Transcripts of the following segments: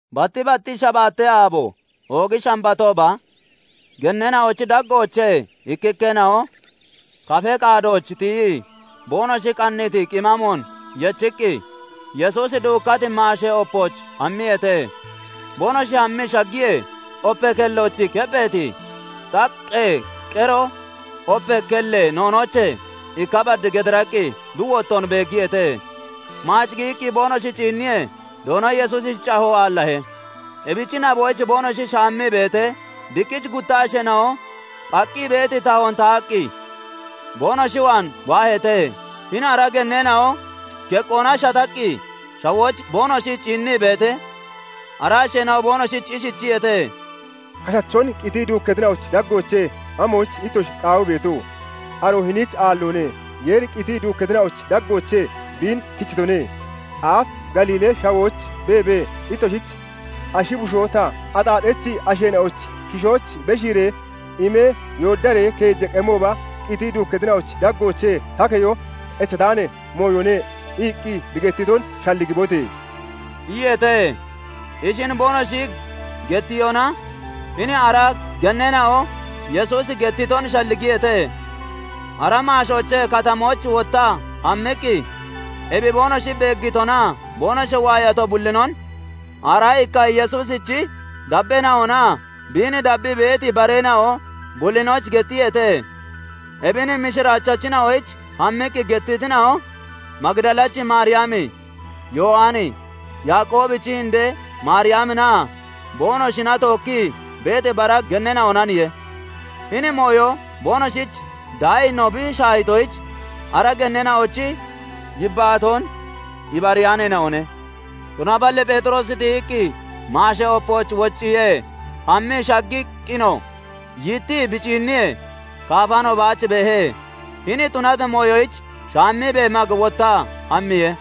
Batti batti shabaatee aabo, oogi shambatooba genneena'ochi daggoochee ikkikkeena'o kafee qaadooch tiyii, boonoshi qanniiti qimaamoon yechiqqi Yesuusi duukkati maashee opooch hammiyeete. Boonoshi hammii shaggiyee, opee kellooch keppheeti xaqqee qeroo opee kellee noonoochee ikka bad gediraqqi bi wottoon beeggiyeete; maac giyiqqi boonoshi ciinniyee, Doono Yesuusichi cahoo aallahe. Ebichi naboyich boonoshi shaammii beetee, diqqich gutta asheena'o phaqqi beeti tahoon tahaqqi boonoshi waan waaheete. Hini ara genneena'o keqqoona shataqqi shawooch boonoshi ciinnii beetee, ara asheena'o boonoshich ishichiyeete:- " 'Kashachon qitii duukkatina'ochi daggoochee amoyichiye ittoshi qaawii beeto? Aroo hiniich aalloone;Yeeri qitii duukkatina'ochi daggoochee biin kechitone. Aaf Galiilee Shawooch beebee, ittoshich 'Ashi bushoo ta, axaaxachi asheena'ochi kishooch beshiiree imee, yooddaree keeja qemooba qitii duukkatina'ochi daggoochee ta keyo echataani mooyone' iqqi bi gettiton shalligibote!" iyeete. Ishin boonoshi gettiyona, hini ara genneena'o Yesuusi gettiton shalligiyeete. Ara maashoochee katamooch wottaa hammiqqi, ebi boonoshi beeggitonaa boonoshi waayato bullinon aaraa ikka Yesuusichi dabbeena'onaa biin dabbii beeti bareena'o bullinoyich gettiyeete. Ebin mishiraachachina'oyich hammiqqi gettitina'o, Magidalachi Maariyami, Yowani, Yaaqoobichi indee Maariyaminaa boonoshina tookkii beeti bara genneena'onaniye. Hini mooyo boonoshich daayino bi shaahitoyich, ara genneena'ochi yibbaatoon ibariyaaneena'one. Tunaballi Pheexiroosi tiyiqqi maashee opooch wocciye; hammii shaggiqqinoo yittii bi ciinniyee, kaafano baach beehe; hini tunati mooyoyich shaammiibee mag wottaa hammiye.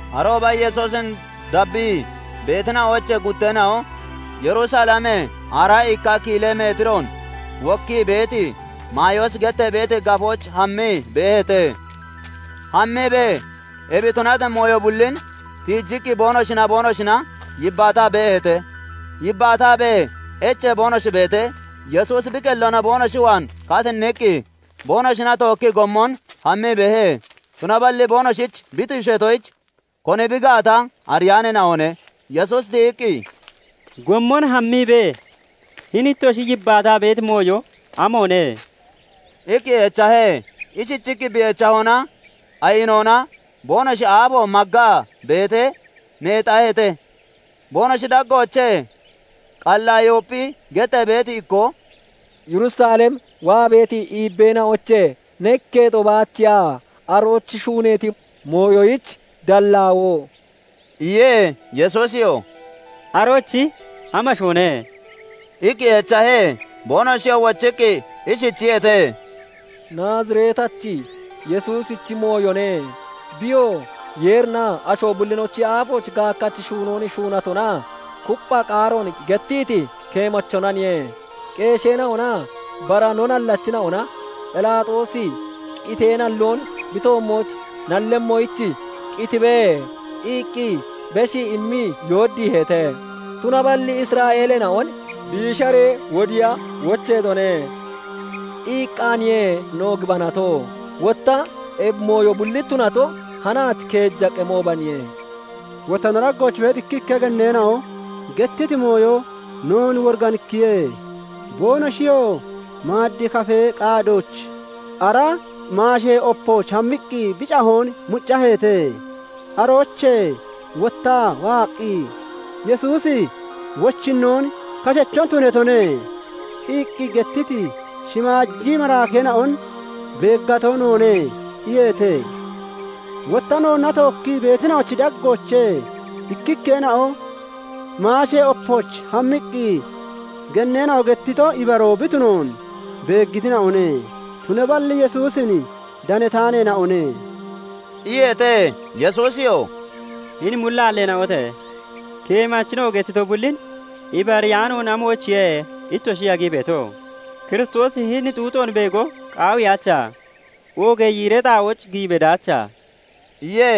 Arooba Yesuusin dabbii beetina'oochee gutteena'o Yerusalemee, aaraa ikka kiilee metiroon wokkii beeti Mayoosi gettee beeti gafooch hammii beeheete; hammiibee ebi tunati mooyo bullin tiijiqqi boonoshinaa boonoshina yibbaataa beeheete. Yibbaataabee echee boonoshi beetee, Yesuusi bi qelloona boonoshi waan katinniqqi boonoshina tookkii gommon hammii beehe; Tunaballi boonoshich bi tuusheetoyich, koni bi gaata ariyaaneena'one. Yesuusi tiyiqqi "Gommon hammiibee hini ittoshi yibbaataa beeti mooyo amoone?" iqqi echahe. Ishichiqqi bi echahona, ayinoona boonoshi aafo maggaa beetee, neexaheete. Boonoshi daggoochee Qalayoophi gettee beeti ikkoo "Yerusalem waa beeti iibbeena'oochee ne ikketo baachiya arooch shuuneeti mooyoyich dallaawoo?" iye. Yesuusiyoo "Arochi amashoone?" iqqi echahe. Boonoshiyoo wochiqqi ishichiyeete:- "Naazireetachi Yesuusichi mooyone; biyoo Yeerinaa asho bullinochi aafooch gaakkachi shuunoon shuunatonaa kuppha qaaroon gettiti keemachonaniye; Qeesheena'onaa bara no nallachina'ona Phelaaxoosi qitee nalloon bi toommooch nallemmoyich, 'Qitibe!' iqqi beshii immii yooddiiheete. Tunaballi 'Isra'eeleena'on biisharee wodiiya wocheetone' iqqaaniye no gibanato. Wotta ebi mooyo bulli tunato hanaachi keeja qemoobaniye. Wotta no daggooch beeti ikkikka genneena'o gettiti mooyo noon woriganikkiye; boonoshiyoo maaddee kafee qaadooch ara maashee opooch hammiqqi bi cahoon muccaheete; aroochee wottaa waaqqi, ' "Yesuusi wochinnoon kashacho tunatone" iqqi gettiti shimaaji maraakeena'on beeggato noone' iyeete. Wotta noonna tookkii beetina'ochi daggoochee ikkikkeena'o maashee opooch hammiqqi, genneena'o gettito ibaroo bi tunoon beeggitina'one; tunaballi Yesuusin danataaneena'one" iyeete. Yesuusiyoo "Hini mullaalleena'ote! Keemachina'o gettito bullin ibariyaanoon amoyichiye ittoshi yagii beeto? Kiristoosi hini xuuxoon beego qaawiyaacha? Oogee yiiree xaa'ooch giyi bedaacha?" iye.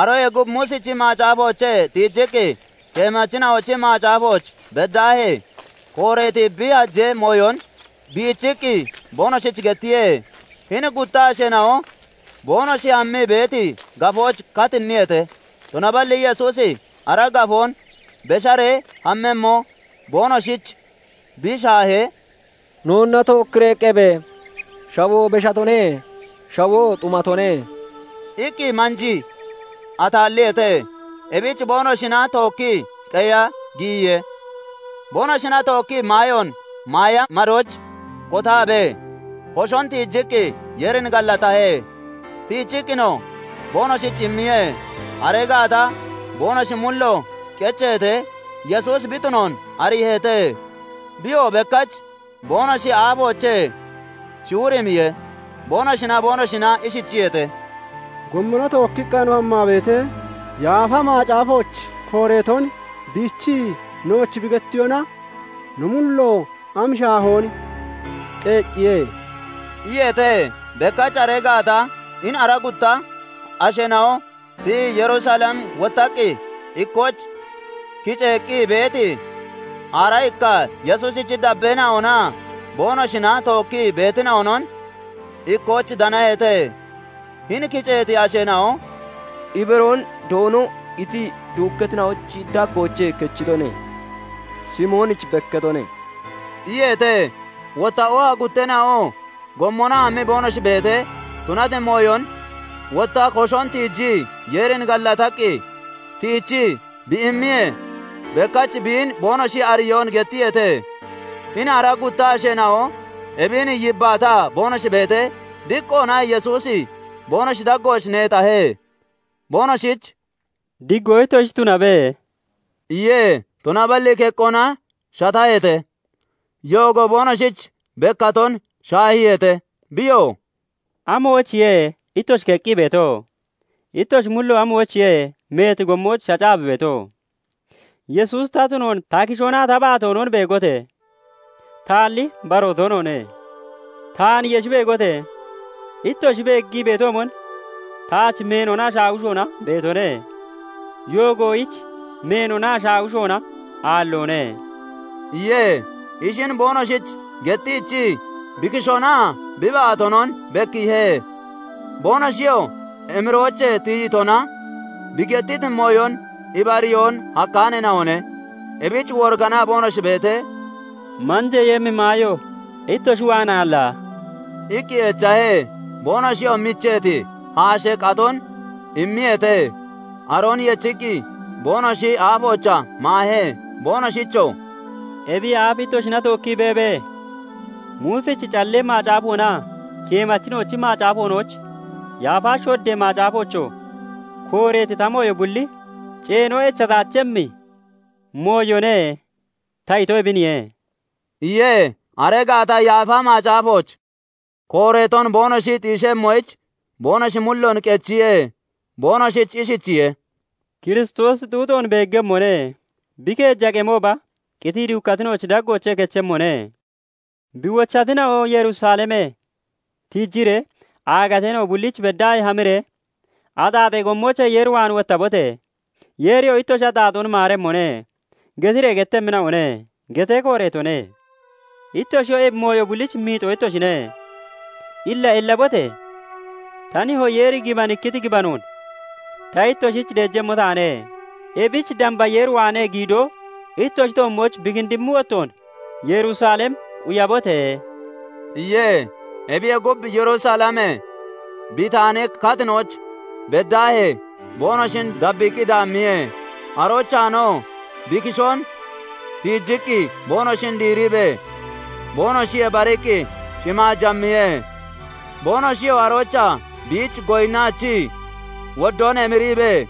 Aroyee gub Muusichi macaafoochee tiijiqqi keemachina'ochi macaafooch beddaahee kooreeti bi hajee mooyon biichiqqi boonoshich gettiye. Hini gutta asheena'o boonoshi hammii beeti gafooch katinniyeete; tunaballi Yesuusi ara gafoon besharee hammemmo boonoshich bi shaahee, "Noonna tookkiree qebe! Shawoo beshatone; shawoo xumatone" iqqi manjii ataalliyeete. Ebich boonoshina tookkii qeya giyiye. Boonoshina tookkii maayoon maaya madooch kotaabee, koshon tiijiqqi Yeerin gallatahe; tiichiqqinoo boonoshich immiye. Aree gaata boonoshi mullo qecheetee, Yesuusi bi tunoon ariiheete; biyoo bekkach boonoshi aafoochee shiwirimmiye. Boonoshinaa boonoshina ishichiyeete:- "Gommona tookkiqqa no waa beetee, Yaafa Macaafooch kooreeton biichii nooch bi gettiyona, no mullo am shaahoon qeecciye!" iyeete. Bekkach aree gaata hini ara gutta asheena'o tiyii Yerusalem wottaqqi, ikkooch kiceeqqi beeti aaraa ikka Yesuusichi dabbeena'onaa boonoshina tookkii beetina'onon ikkooch danaheete. Hini kiceeti asheena'o "Ibaroon Doono qitii duukkatina'ochi daggoochee kechitone! Simoonich bekkatone" iyeete. Wotta oha gutteena'oo gommona hammii boonoshi beetee tunati mooyon, wotta koshon tiijii Yeerin gallataqqi tiichii bi immiyee, bekkach biin boonoshi ariyoon gettiyeete. Hini ara gutta asheena'o ebin yibbaataa boonoshi beetee, diqqoona Yesuusi boonoshi daggooch neexahe. Boonoshich "Diggoo ittoshich tunabe!" iye. Tunaballi keqqoona shataheete; yoogo boonoshich bekkaton shaahiiheete. Biyoo "Amoyichiye ittoshi keqqii beeto? Ittoshi mullo amoyichiye meeti gommooch shacaa bi beeto? Yesuusi ta tunoon ta kishoonaa ta baatoonon beegote! Taalli, baroo toonoone; taan yeshi beegote! Ittoshi beeggii beetoomon taach meenonaa shaawishona beetone; yoogoyich meenonaa shaawishona aalloone" iye. Ishin boonoshich gettiichii bi kishoonaa bi baatoonon bekkiihe. Boonoshiyoo emiroochee tiyitona bi gettiti mooyon ibariyoon hakkaaneena'one. Ebich woriganaa boonoshi beetee, "Manjeeyemmi maayo ittoshi waan aalla?" iqqi echahe. Boonoshiyoo micheeti haashee qaton immiyeete. Aroon yechiqqi boonoshi aafoochaa maahe. Boonoshichoo "Ebiyee aaf ittoshina tookkii beebee, 'Muusichi Callee Macaafoonaa Keemachina'ochi Macaafoonooch, Yaafa Shoddee macaafoochoo kooreeti ta mooyo bulli ceeno echataachemmi mooyone' ta ito ebiniye" iye. Aree gaata Yaafa Macaafooch kooreeton boonoshi xiishemmoyich, boonoshi mulloon qechiye; boonoshich ishichiye:- " 'Kiristoosi xuuxoon beeggemmone; bi keeja qemooba qitii duukkatina'ochi daggoochee kechemmone; Bi wochatina'oo Yerusalemee tiijiree aagateena'o bulliichi beddaahee hamiree "Axaaxee gommoochee Yeer waan wottabote! Yeeriyoo ittoshi axaaxoon maaremmone" getiree gettemmina'one' getee kooreetone. Ittoshiyoo ebi mooyo bullich miixoo ittoshine. Illa ellabote! Ta nihoo Yeeri gibanikkiti gibanoon ta ittoshich deejemmo taane; ebich damba Yeer waanee giidoo ittoshi toommooch bi kindimmi wottoon Yerusalem quyabote!" iye. Ebiyee gub, Yerusalemee Bitaani katinooch beddaahee boonoshin dabbiiqqi daammiye; aroochaanoo bi kishoon tiijiqqi boonoshin diiriibee, boonoshiyee bariqqi shimaaj hammiye. Boonoshiyoo aroochaa biich goyinnaachii, woddoon emiriibee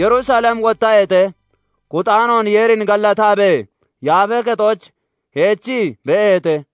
Yerusalem wottaheete; kuxaanoon Yeerin gallataabee, Yaafee Kexooch heechii beeheete.